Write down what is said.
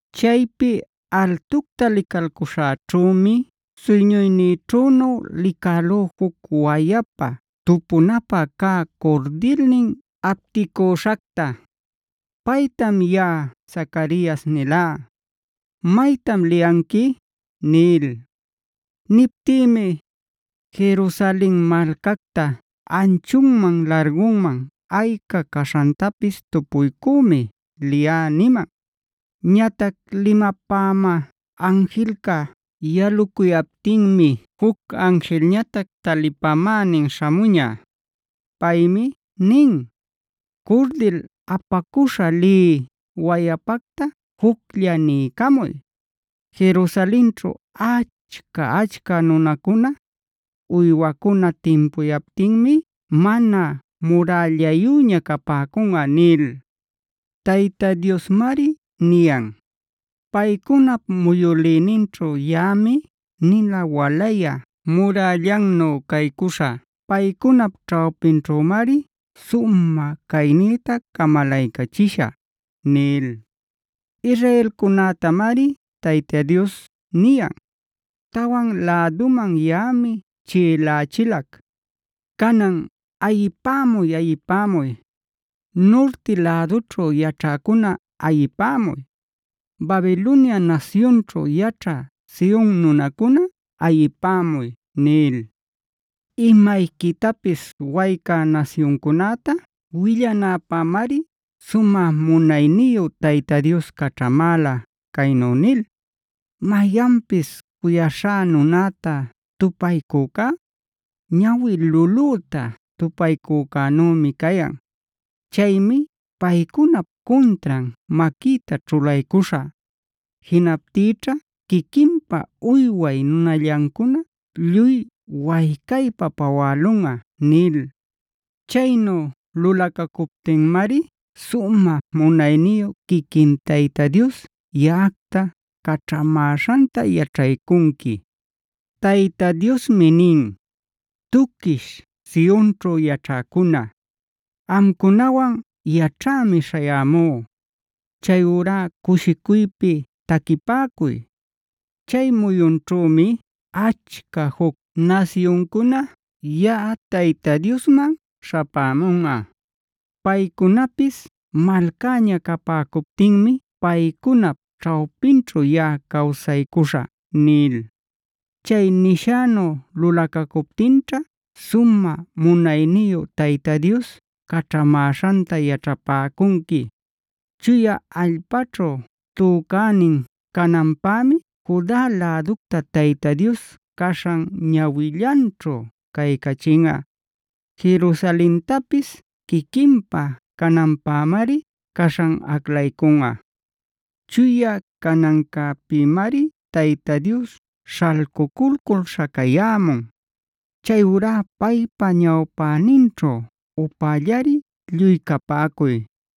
Chaypi altucta licalcuśhäćhümi suyñuynïćhünu licälú juc wayapa tupunapä cä curdilnin apticüśhacta. Paytam yaꞌa Zacarias nilá: “¿Maytam liyanqui?” nil. Niptïmi: “Jerusalen malcacta anchunman largunman ayca caśhantapis tupuycümi liyá” niman. Ñatac limapämä anjilca yalucuyaptinmi juc anjilñatac talipänin śhamuña. Paymi nin: “Curdil apacüśha lï wayapacta juclla niycamuy: ‘Jerusalenćhu achca-achca nunacuna, uywacuna timpuyaptinmi mana murällayüña capäcunꞌa’ nil. Tayta Diosmari niyan: ‘Paycunap muyülïninćhu yaꞌami nina walayä murällannu caycuśhä; paycunap ćhawpinćhümari sumä caynïta camalaycachishä’” nil. Israelcunätamari Tayta Dios niyan: “Tawan läduman yaꞌami chiꞌilächilac. Canan ¡ayipämuy, ayipämuy! Nurti lädućhu yaćhäcuna ayipämuy. ¡Babilonia nasyunćhu yaćhä Sion nunacuna ayipämuy!” nil. Imayquitapis waycä nasyuncunäta willanäpämari sumä munayniyu Tayta Dios caćhamäla caynu nil: “Mayanpis cuyaśhá nunäta tupaycücá, ñawi lulüta tupaycücänümi cayan. Chaymi paycunap cuntran maquïta ćhulaycuśhä. Jinaptïćha quiquinpa uyway nunallancuna lluy waycaypa pawälunꞌa” nil. Chaynu lulacacuptinmari sumä munayniyu quiquin Tayta Dios yaꞌacta caćhamäśhanta yaćhaycunqui. Tayta Diosmi nin: “Tuquish Sionćhu yaćhäcuna, amcunawan yaćhämi śhayämú. Chayurá cushicuypi taquipäcuy. Chay muyunćhümi achca juc nasyuncuna yaꞌa Tayta Diosman śhapämunꞌa. Paycunapis malcäña capäcuptinmi paycunap ćhawpinćhu yaꞌa cawsaycuśhä” nil. Chay nishänu lulacacuptinćha sumä munayniyu Tayta Dios caćhamäśhanta yaćhapäcunqui. Chuya allpaćhu tücänin cananpämi Juda läducta Tayta Dios caśhan ñawillanćhu caycachinꞌa. Jerusalentapis quiquinpä cananpämari caśhan aclaycunꞌa. Chuya canancäpïmari Tayta Dios śhalcuculcul śhacayämun. Chayurá paypa ñawpäninćhu upällari lluy capäcuy.